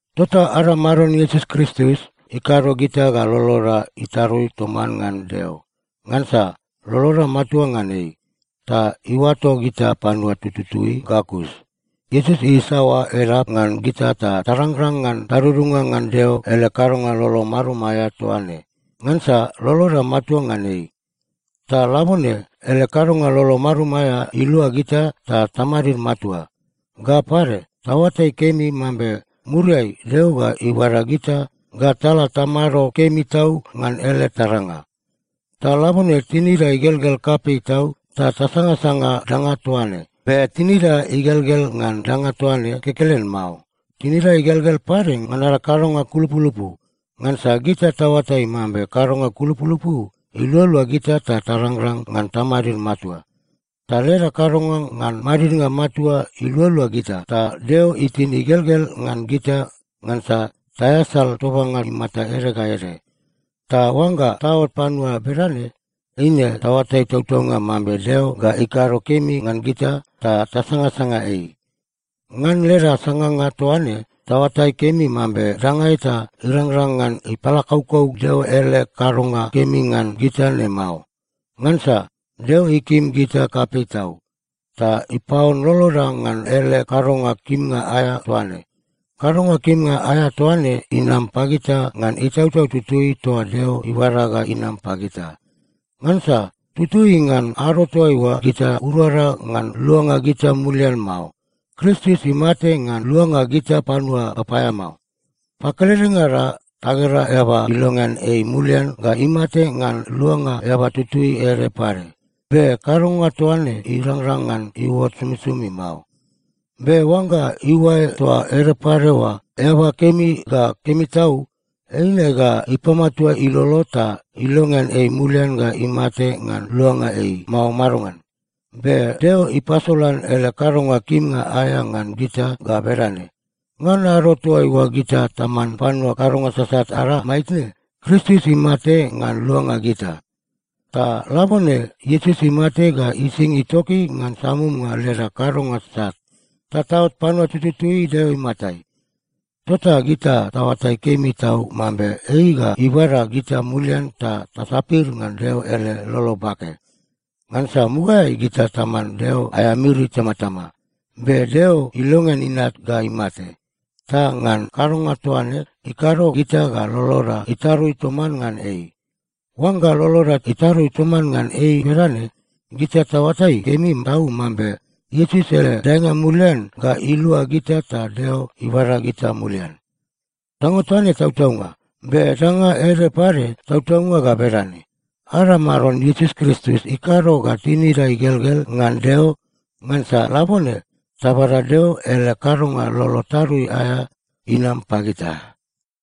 Tota ada Maron Iesus Kristus ikado gita ga loloda itarui toman ngan Deo, ngansa loloda matua ngan ei, ta iuato gita panua tututui ga kus. Iesus isaoa edap ngan gita ta tarangrang ngan tadudunga ngan Deo ele kadonga lolo marum aea toa ne, ngansa loloda matua ngan ei. Ta labone ele kadonga lolo marum aea ilua gita ta tamadid matua. Ga pade, taoatai kemi mambe muriai Deo ga ibada gita ga tala tamado kemi tau ngan ele taranga. Ta labone tinida igelgel kapei tau ta tasangasanga danga toa ne. Be tinida igelgel ngan danga toa ne kekelen mao. Tinida igelgel pade ngan ada kadonga kulupulupu. Ngansa gita taoatai mambe kadonga kulupulupu ilualua gita ta tarangrang ngan tamadid matua. Ta leda kadonga ngan madidnga matua ilualua gita, ta Deo itin igelgel ngan gita ngansa taeasal tobanga imata ede ga ede. Ta oangga taot panua bedane, eine taoatai tautaunga mambe Deo ga ikado kemi ngan gita, ta tasangasanga ei. Ngan leda sanganga toa ne, taoatai kemi mambe danga eta irangrang ngan ipalakaukau Deo ele kadonga kemi ngan gita ne mao. Ngansa Deo ikim gita kapei tau, ta ipaon loloda ngan ele kadonga kimnga aea toa ne. Kadonga kimnga aea toa ne inam pagita ngan Itautau Tutui toa Deo ibada ga inam pagita. Ngansa tutui ngan ado toaiua gita urada ngan luanga gita mulian mao, Kristus imate ngan luanga gita panua papaeamao. Pakeledengada tagera eaba ilongean ei mulian ga imate ngan luanga eaba tutui ede pade. Be kadonga toa ne irangrang ngan iuot somisomi mao. Be oangga iuae toa ede pade oa eaba kemi ga kemi tau, eine ga ipamatua ilolo ta ilongean ei mulian ga imate ngan luanga ei, mao madongan? Be Deo ipasolan ele kadonga kimnga aea ngan gita ga bedane: Ngan ado toaiua gita taman panua kadonga sasat ada maitne, Kristus imate ngan luanga gita. Ta labone Iesus imate ga ising itoki ngan samumnga leda kadonga sat, ta taot panua tututui Deo imatai. Tota gita taoatai kemi tau mambe ei ga ibada gita mulian ta tasapir ngan Deo ele lolo bake. Ngansa mugaeai gita taman Deo aea miri itamatama, be Deo ilongean Inat ga imate. Ta ngan kadonga toa ne, ikado gita ga loloda itarui toman ngan ei. Oangga loloda itarui toman ngan ei bedane, gita taoatai kemi tau mambe Iesus ele daenga mulian ga ilua gita ta Deo ibada gita mulian. Danga toa ne tautaunga. Be danga ede pade tautaunga ga bedane: Ada Maron Iesus Kristus ikado ga tinida igelgel ngan Deo, ngansa labone tabada Deo ele kadonga lolo tarui aea inam pagita.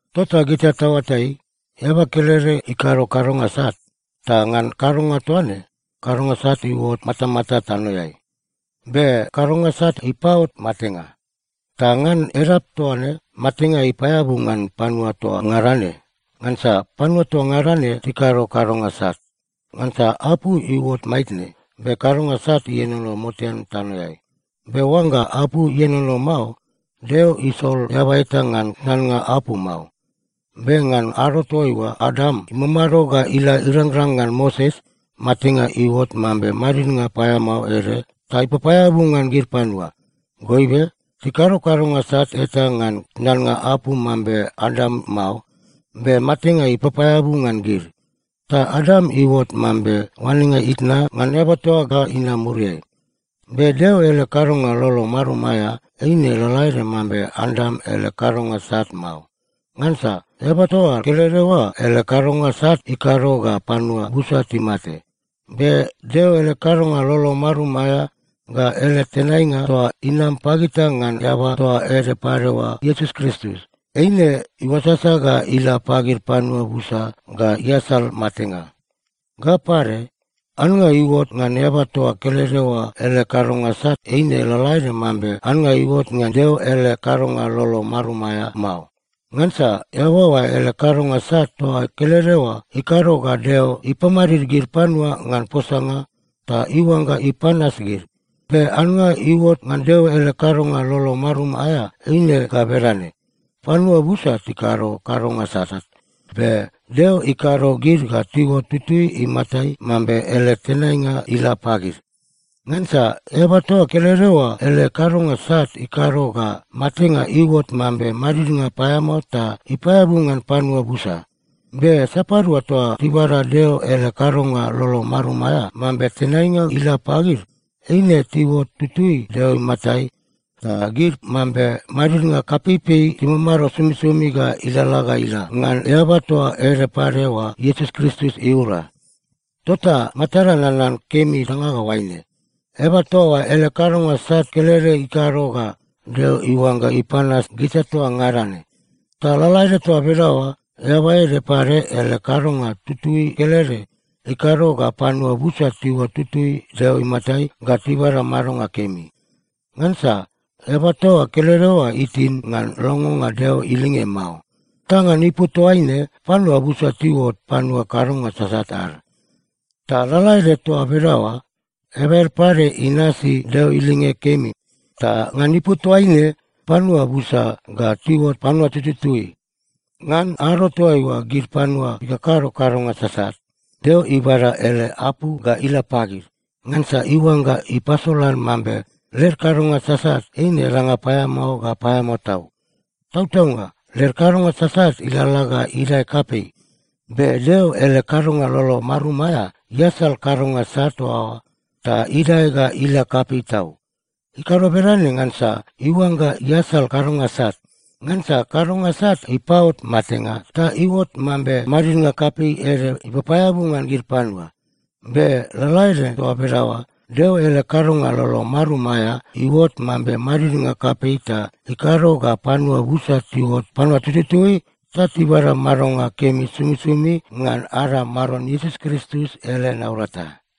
Tota gita taoatai, eaba kelede ikado kadonga sat, ta ngan kadonga toa ne, kadonga sat iuot matamata tanoeai. Be kadonga sat ipaot matenga. Ta ngan edap toa ne matenga ipaeabu ngan panua toa ngada ne, ngansa panua toa ngada ne tikado kadonga sat. Ngansa apu iuot maitne, be kadonga sat ienono motean tanoeai. Be oangga apu ienono mao, Deo isol eaba eta ngan tnannga apu mao. Be ngan ado toaiua Adam imamado ga ila irangrang ngan Moses, matenga iuot mambe madidnga paeamao ede ta ipapaeabu ngan gid panua. Goibe tikado kadonga sat eta ngan tnannga apu mambe Adam mao, be matenga ipapaeabu ngan gid. Ta Adam iuot mambe oanenga itna ngan eaba toa ga inam muriai. Be Deo ele kadonga lolo marum aea eine lalaede mambe Adam ele kadonga sat mao. Ngansa eaba toa kelede oa ele kadonga sat ikado ga panua busa timate. Be Deo ele kadonga lolo marum aea ga ele tenainga toa inam pagita ngan eaba toa ede pade oa Iesus Kristus, eine iuasasa ga ila pagid panua busa ga iasal matenga. Ga pade, annga iuot ngan eaba toa kelede oa ele kadonga sat eine lalaede mambe annga iuot ngan Deo ele kadonga lolo marum aea mao. Ngansa eaba oa ele kadonga sat toa kelede oa ikado ga Deo ipamadid gid panua ngan posanga ta iuangga ipanas gid. Be annga iuot ngan Deo ele kadonga lolo marum aea eine ga bedane: Panua busa tikado kadonga sasat, be Deo ikado gid ga tiuot tutui imatai mambe ele tenainga ila pagid. Ngansa eaba toa kelede oa ele kadonga sat ikado ga matenga iuot mambe madidnga paeamao ta ipaeabu ngan panua busa. Be sapadua toa tibada Deo ele kadonga lolo marum aea mambe tenainga ila pagid, eine tiuot tutui Deo imatai ta gid mambe madidnga kapeipei timamado somisomi ga ilalala ga ila ngan eaba toa ede pade oa Iesus Kristus iura. Tota matada nanan kemi danga ga oaine: Eaba toa oa ele kadonga sat kelede ikado ga Deo iuangga ipanas gita toa ngada ne. Ta lalaede toa bedaoa, eaba ede pade ele kadonga tutui kelede ikado ga panua busa tiuot tutui Deo imatai ga tibada madonga kemi. Ngansa eaba toa kelede oa itin ngan longonga Deo ilinge mao. Ta ngan ipu toaine panua busa tiuot panua kadonga sasat ad. Ta lalaede toa bedaoa, eaba ede pade inasi Deo ilinge kemi, ta ngan ipu toaine panua busa ga tiuot panua tututui. Ngan ado toaiua gid panua tikakado kadonga sasat, Deo ibada ele apu ga ila pagid, ngansa iuangga ipasolan mambe led kadonga sasat eine danga paeamao ga paeamao tau. Tautaunga led kadonga sasat ilalala ga idae kapei, be Deo ele kadonga lolo marum aea iasal kadonga sat toa oa ta idae ga ila kapei tau. Ikado bedane ngansa iuangga iasal kadonga sat. Ngansa kadonga sat ipaot matenga ta iuot mambe madidnga kapei ede ipapaeabu ngan gid panua. Be lalaede toa bedaoa, Deo ele kadonga lolo marum aea iuot mambe madidnga kapei ta ikado ga panua busa tiuot panua tututui ta tibada madonga kemi somisomi ngan ada Maron Iesus Kristus ele naurata.